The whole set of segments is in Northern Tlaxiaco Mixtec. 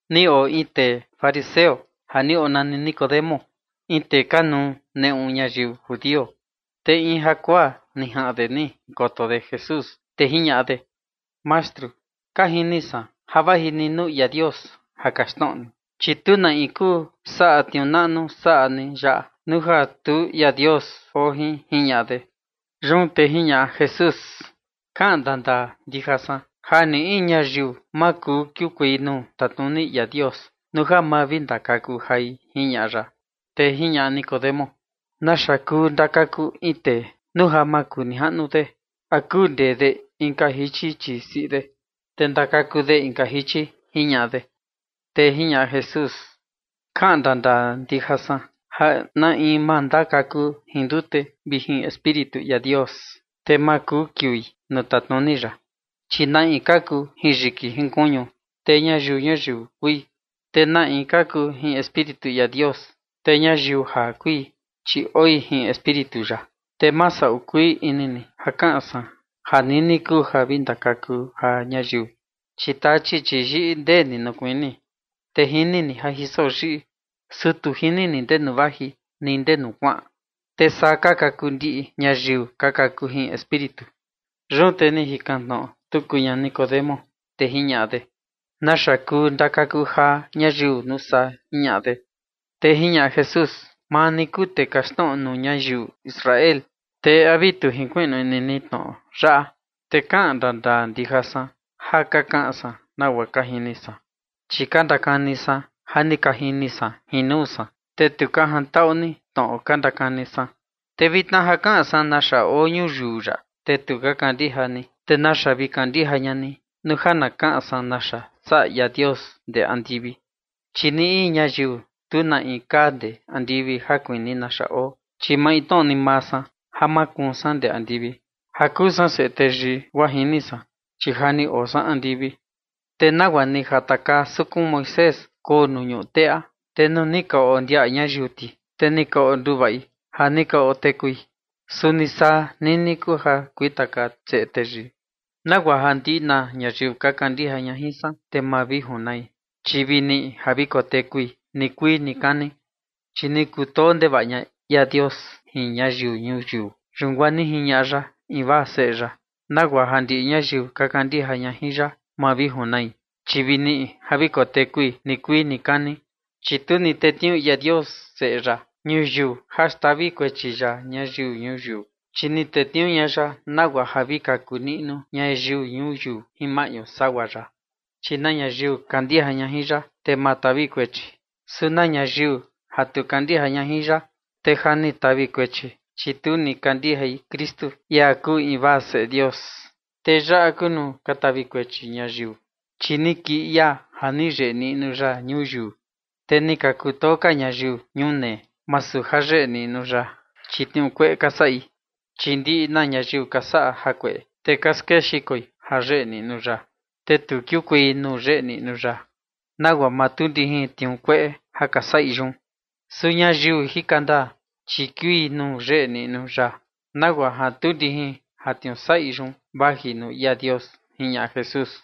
Ni oo in tee fariseo ja ni onani Nicodemo, in tee kanuu neꞌu ñayiu judio. Te in jakuaa ni jaꞌan de ni jinkoto de Jesús, te jiñaꞌa de: ―Mastru, ka jini san ja vaji ni nuu ia Dios ja kaxtnoꞌo ni, chi tu na in kuu saꞌa tniuu naꞌnu saꞌa ni yaꞌa nuu ja tu ia Dios oo jin ―jiñaꞌa de. Yun te jiñaꞌa Jesús: ―Kaꞌan ndandaa ndija san ja ni in ñayiu ma kuu kiukuei nuu tatnuni ia Dios nuu ja ma vi ndakaku jai ―jiñaꞌa ya. Te jiñaꞌa Nicodemo: ―¿Naxa kuu ndakaku in tee nuu ja makunijaꞌnu de? ¿A kuu ndee de inka jichi chii siꞌi de, te ndakaku de inka jichi? ―jiñaꞌa de. Te jiñaꞌa Jesús: ―Kaꞌan ndandaa ndija san ja na in ma ndakaku jin ndute vi jin Espíritu ia Dios, te ma kuu kiui nuu tatnuni ya. Chi na in kaku jin yiki kuñu, te ñayiu ñuyiu kui. Te na in kaku jin Espíritu ia Dios, te ñayiu jaa kui, chi oi jin Espíritu ya. Te ma saꞌu kuii ini ni ja kaꞌan san ja nini kuu ja vi ndakaku jaa ñayiu. Chi tachi, chi yiꞌi ndee ni nuu kuini, te jini ni ja jiso yiꞌi, su tu jini ni ndenu vaji ni ndenu kuaꞌan. Te saa ka kuu ndiꞌi ñayiu ka kaku jin Espíritu. Yun te ni jikan tnoꞌo tuku ña Nicodemo, te jiñaꞌa de: ―¿Naxa kuu ndakaku jaa ñayiu, nuu saa? ―jiñaꞌa de. Te jiñaꞌa Jesús: ―Maa ni kuu tee kaxtnoꞌo nuu ñayiu Israel, ¿te a vi tu jinkuiꞌnu ini ni tnoꞌo yaꞌa? Te kaꞌan ndandaa ndija san ja ka kaꞌan san nagua ka jini san, chi ka ndakani san ja ni ka jini san jin nuu san, te tu ka jantaꞌu ni tnoꞌo ka ndakani san. Te vitna ja kaꞌan san naxa oo ñuyiu yaꞌa, te tu ka kandija ni, ¿te naxa vi kandija ña ni nuu ja na kaꞌan san naxa saꞌa ia Dios ndee andivi? ’Chi ni in ñayiu tu na kaa ndee andivi ja kuni naxa oo, chi maintnoꞌo ni maa san ja makuun san ndee andivi ja kuu san Seꞌe Teyii, guaa jini san, chi ja ni oo san andivi. Te nagua ni jatakaa sukun Moisés koo nuu ñuꞌu teꞌa, (te nuu ni ka ondiaꞌa ñayiu ti, te ni ka onduvaꞌi ja ni ka otekui), suni saa nini kuu ja kuintakaa Seꞌe Teyii, nagua ja ndiꞌi na ñayiu ka kandija ña jin san, te ma vi junai, chi vi niꞌi ja vi kotekui nikuii nikani. ’Chi ni kutoo ndevaꞌa ña ia Dios jin ñayiu ñuyiu, yun guaa ni jiñaꞌa ya invaa Seꞌe ya, nagua ja ndiꞌi ñayiu ka kandija ña jin ya ma vi junai, chi vi niꞌi ja vi kotekui nikuii nikani. Chi tu ni tetniuu ia Dios Seꞌe ya ñuyiu ja xtavi kuechi ya ñayiu ñuyiu, chi ni tetniuu ña ya nagua ja vi kaku niꞌnu ñayiu ñuyiu jin maꞌñu sagua ya. ’Chi na ñayiu kandija ña jin ya, te ma tavi kuechi. Su na ñayiu tu kandija ya, te ja ni tavi kuechi, chi tu ni kandijai Kristu, ia kuu invaa Seꞌe Dios. Te yaꞌa kuu nuu ka tavi kuechi ñayiu, chi ni kii ia ja ni yeꞌe niꞌnu ya ñuyiu, te ni ka kutoo ka ñayiu ñunee, masu ja yeꞌe niꞌnu ya, chi tniuu kueꞌe ka saꞌi. Chi ndiꞌi na ñayiu ka saꞌa jakueꞌe, te ka skexikoi ja yeꞌe niꞌnu ya, te tu kiukuei nuu yeꞌe niꞌnu ya, nagua ja ma tuu ndijin tniuu kueꞌe ja ka saꞌi yun. Su ñayiu jika ndaa, chi kiui nuu yeꞌe niꞌnu ya, nagua ja tuu ndijin ja tniuu saꞌi yun vaji nuu ia Dios ―jiñaꞌa Jesús.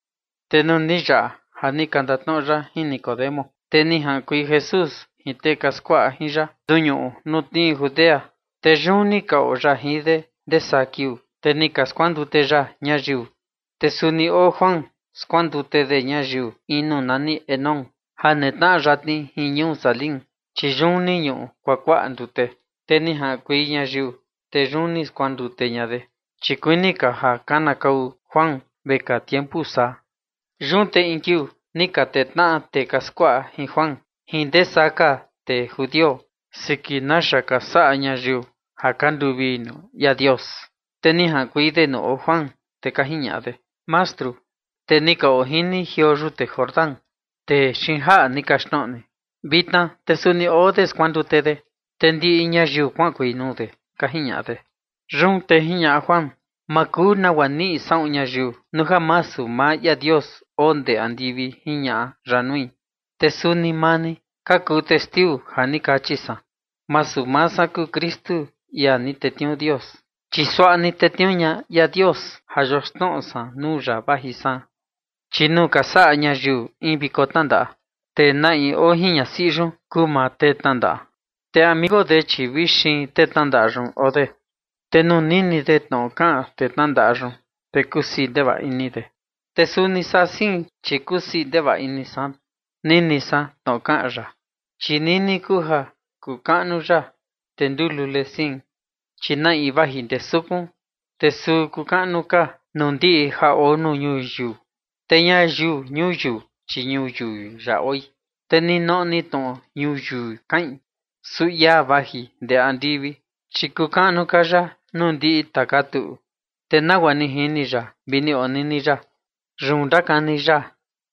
Te nuu ni yaꞌa ja ni ka ndatnoꞌo ya jin Nicodemo, te ni jaꞌankuei Jesús jin tee ka skuaꞌa jin ya nuu ñuꞌu ja tnii Judea, te yun ni ka oo ya jin de ndee saa kiuu, te ni ka skuandute ya ñayiu. Te suni oo Juan skuandute de ñayiu in nuu nani Enón ja netnaꞌa yatni jin ñuu Salim, chi yun ni ñuꞌu kuakuaꞌa ndute, te ni jaꞌankuei ñayiu, te yun ni skuandute ña de. Chi kuini ka ja kanakau Juan vekaa tiempu saa. Yun te in kiuu ni ka tee tnaꞌa tee ka skuaꞌa jin Juan jin ndesaa ka tee judio siki naxa ka saꞌa ñayiu ja ka nduvii nuu ia Dios. Te ni jaꞌankuei de nuu oo Juan, te ka jiñaꞌa de: ―Mastru, tee ni ka oo jin ni jioo yute Jordán, tee xiin jaꞌa ni kaxtnoꞌo ni, vitna te suni oo de skuandute de, te ndiꞌi ñayiu kuaꞌankuei nuu de ―ka jiñaꞌa de. Yun te jiñaꞌa Juan: ―Ma kuu nagua niꞌi saꞌun ñayiu nuu ja masu maa ia Dios oo ndee andivi jiñaꞌa ya nui. Te suni maa ni ka kuu testiu ja ni kachi san: “Masu maa san kuu Kristu, ia ni tetniuu Dios, chi suaꞌa ni tetniuu ña ia Dios ja yoxnoꞌo san nuu ya vaji san”. Chi nuu ka saꞌa ñayiu in viko tnandaꞌa, te na in oo jin ñasiꞌi yun kuu maa tee tnandaꞌa, te amigo de, chi vi xiin tee tnandaꞌa yun oo de, te nuu nini de tnoꞌo kaꞌan tee tnandaꞌa yun, te kusii ndevaꞌa ini de. Te suni saa ni sein, chi kusii ndevaꞌa ini san nini san tnoꞌo kaꞌan ya. Chi nini kuu ja kuu kaꞌnu ya, te nduu lule sein. ’Chi na in vaji ndee sukun, te suu kuu kaꞌnu ka nuu ndiꞌi ja oo nuu ñuyiu. Te ñayiu ñuyiu, chi ñuyiu yaꞌa oi, te ninoꞌo ni tnoꞌo ñuyiu kaꞌin, su ia vaji ndee andivi, chi kuu kaꞌnu ka ya nuu ndiꞌi tuꞌu. Te nagua ni jini ya vi ni onini ya, yun ndakani ya,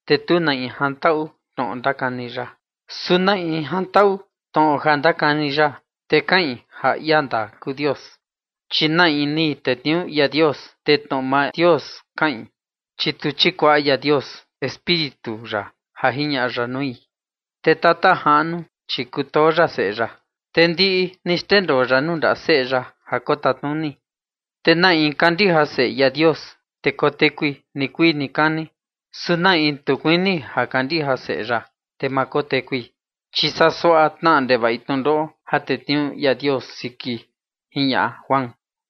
te tu na in jantaꞌu tnoꞌo ndakani ya. Su na in jantaꞌu tnoꞌo ja ndakani ya, te kaꞌin ja ia ndaa kuu Dios. Chi na in ni tetniuu ia Dios, te tnoꞌo maa Dios kaꞌin, chi tu chikuaꞌa ia Dios Espíritu ya ja jiñaꞌa ya nui. Te Tata Jaꞌnu, chi kutoo ya Seꞌe ya, te ndiꞌi ni xndendoo ya nuu ndaꞌa Seꞌe ya ja kotatnuni. Te na in kandija Seꞌe ia Dios, te kotekui nikuii nikani, su na in tu kuini ja kandija Seꞌe ya, te ma kotekui, chi saa suaꞌa tnaꞌa ndevaꞌi tnundoꞌo ja tetniuu ia Dios siki ―jiñaꞌa Juan.